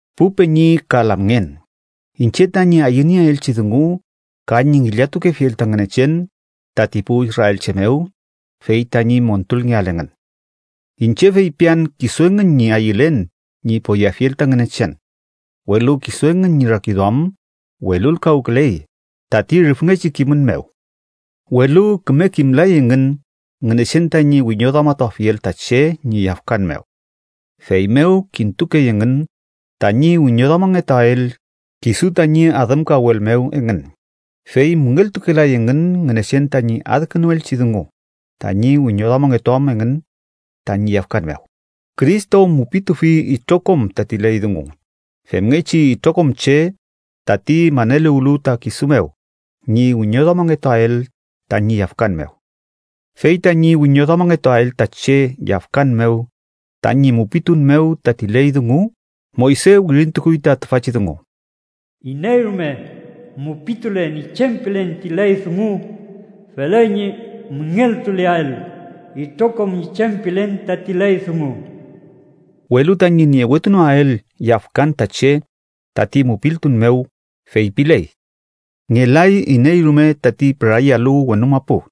Pu peñi ka lamngen, iñche tañi ayünieelchi dungu ka ñi ngillatukefiel ta Ngünechen tati pu israelche mew, fey tañi montulngeael engün. Iñche feypian kisu engün ñi ayülen ñi poyeafiel ta Ngünechen, welu kisu engün ñi rakiduam welulkawküley tati rüfngechi kimün mew. Welu küme kimlay engün Ngünechen tañi wiñoduamatuafiel ta che ñi yafkan mew. Feymew kintukey engün tañi wiñoduamangetuael kisu tañi adümkawel mew engün, fey müngeltukelay engün Ngünechen tañi adkünuelchi dungu tañi wiñoduamangetuam engün tañi yafkan mew. Cristo mupitufi itrokom tati ley dungu femngechi itrokom che, tati maneluwlu ta kisu mew, ñi wiñoduamangetuael tañi yafkan mew. Fey tañi wiñoduamangetuael ta che yafkan mew tañi mupitun mew tati ley dungu, Moyse wirintukuy ta tüfachi dungu: “Iney rume mupitule ñi chem pilen ti ley dungu, feley ñi müngeltuleael itrokom ñi chem pilen tati ley dungu.” Welu tañi niewetunoael yafkan ta che tati mupiltun mew, feypiley: “Ngelay iney rume tati pürayalu wenu mapu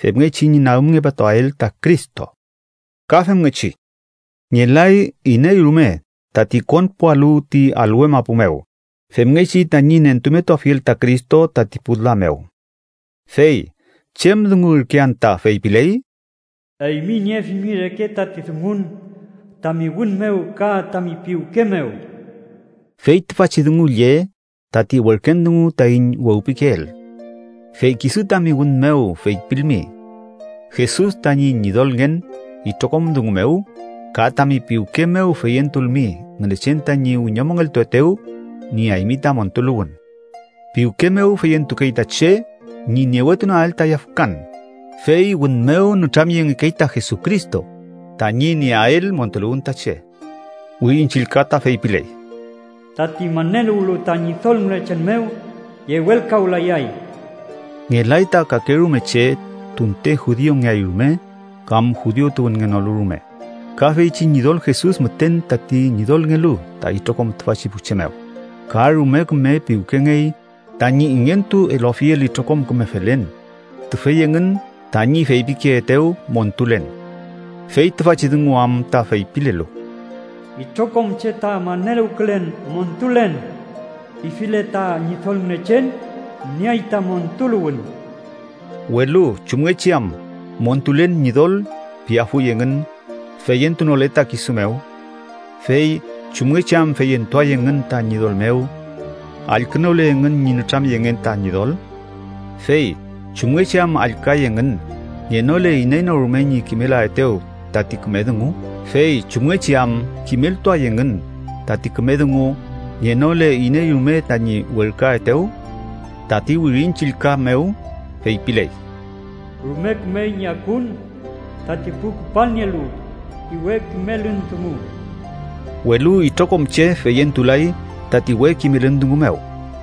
femngechi ñi nagümngepatuael ta Cristo.” Ka femngechi “ngelay iney rume tati konpualu ti alwe mapu mew femngechi tañi nentumetuafiel ta Cristo tati pu la mew.” Fey ¿chem dungu ürke anta feypiley? “Eymi niefimi reke tati dungun, tami wün mew ka tami piwke mew.” Fey tüfachi dungu lle tati werken dungu taiñ wewpikeel. Fey kisu tami wün mew feypilmi “Jesus tañi Ñidolngen” itrokom dungu mew, ka tami piwke mew feyentulmi Ngünechen tañi wiñomongeltuetew, nieaymi ta montuluwün. Piwke mew feyentukey ta che ñi niewetunoael ta yafkan, fey wün mew nütramyengekey ta Jesucristo tañi nieael montuluwün ta che. Wirin Chillka ta feypiley: “Tati maneluwlu ta Ñidol Ngünechen mew, yewelkawlayay.” Ngelay ta kakerume che tunte judiungeay rume kam judiu tuwünngenolu rume, ka feychi Ñidol Jesus müten tati Ñidolngelu ta itrokom tüfachi pu che mew, ka rume küme piwkengey tañi ingentu eluafiel itrokom küme felen tüfey engün tañi feypikeetew montulen. Fey tüfachi dungu am ta feypilelu: “Itrokom che ta maneluwkülen ‘montulen’ pifile ta Ñidol Ngünechen, nieay ta montuluwün.” Welu ¿chumngechi am “montulen” Ñidol piafuy engün, feyentunole ta kisu mew? ¿Fey chumngechi am feyentuay engün ta Ñidol mew, allkünole engün ñi nütramyengen ta Ñidol? ¿Fey chumngechi am allküay engün, ngenole iney no rume ñi kimelaetew tati küme dungu? ¿Fey chumngechi am kimeltuay engün tati küme dungu, ngenole iney rume tañi werküaetew? Tati Wirin Chillka mew feypiley: “¡Rume kümey ñi akun tati pu küpalnielu ti we kimelün dungu!” Welu itrokom che feyentulay tati we kimelün dungu mew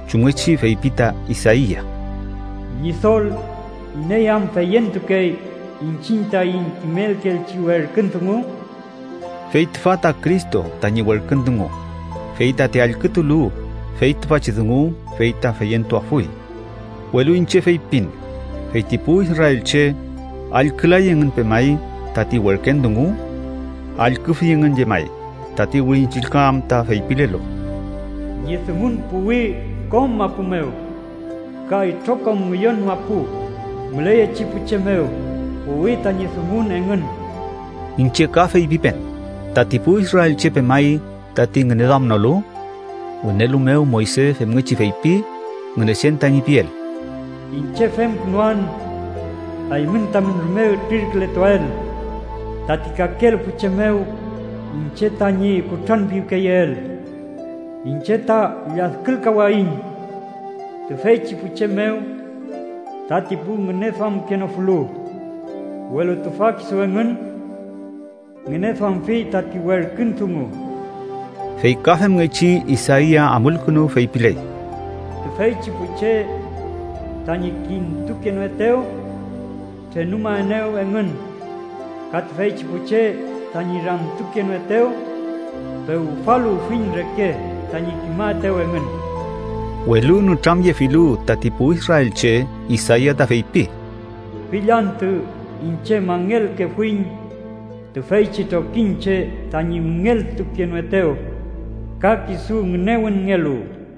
chumngechi feypi ta Isaia: “¿Ñidol, iney am feyentukey iñchiñ taiñ kimelkeelchi werkün dungu?” Fey tüfa ta Cristo tañi werkün dungu fey tati allkütulu fey tüfachi dungu, fey ta feyentuafuy. Welu iñche feypin: Fey ti pu israelche, ¿allkülay engün pemay tati werken dungu? ¡Allküfi engün llemay! Tati Wirin Chillka am ta feypilelu: “Ñi dungun puwi kom mapu mew. Ka itrokom ngüyon mapu müleyechi pu che mew puwi tañi dungun engün.” Iñche ka feypipen: ¿Tati pu israelche pemay tati ngüneduamnolu? Wünelu mew Moyse femngechi feypi Ngünechen tañi piel: “Iñche femkünuan eymün tamün rume ütrirkületuael tati kakelu pu che mew, iñche tañi kutranpiwkeyeel. Iñche ta lladkülkawayiñ tüfeychi pu che mew tati pu ngüneduamkenofulu, welu tüfa kisu engün ngüneduamfi tati werkün dungu.” Fey ka femngechi, Isaia amulkünu feypiley: “Tüfeychi pu che tañi kintukenoetew, trenumaenew engün ka tüfeychi pu che tañi ramtukenoetew, pewfaluwfiñ reke tañi kimaetew engün.” Welu nütramyefilu tati pu israelche, Isaia ta feypi: “Fill antü iñche mangelkefuiñ tüfeychi trokiñche tañi müngeltukenoetew ka kisu ngünewünngelu.”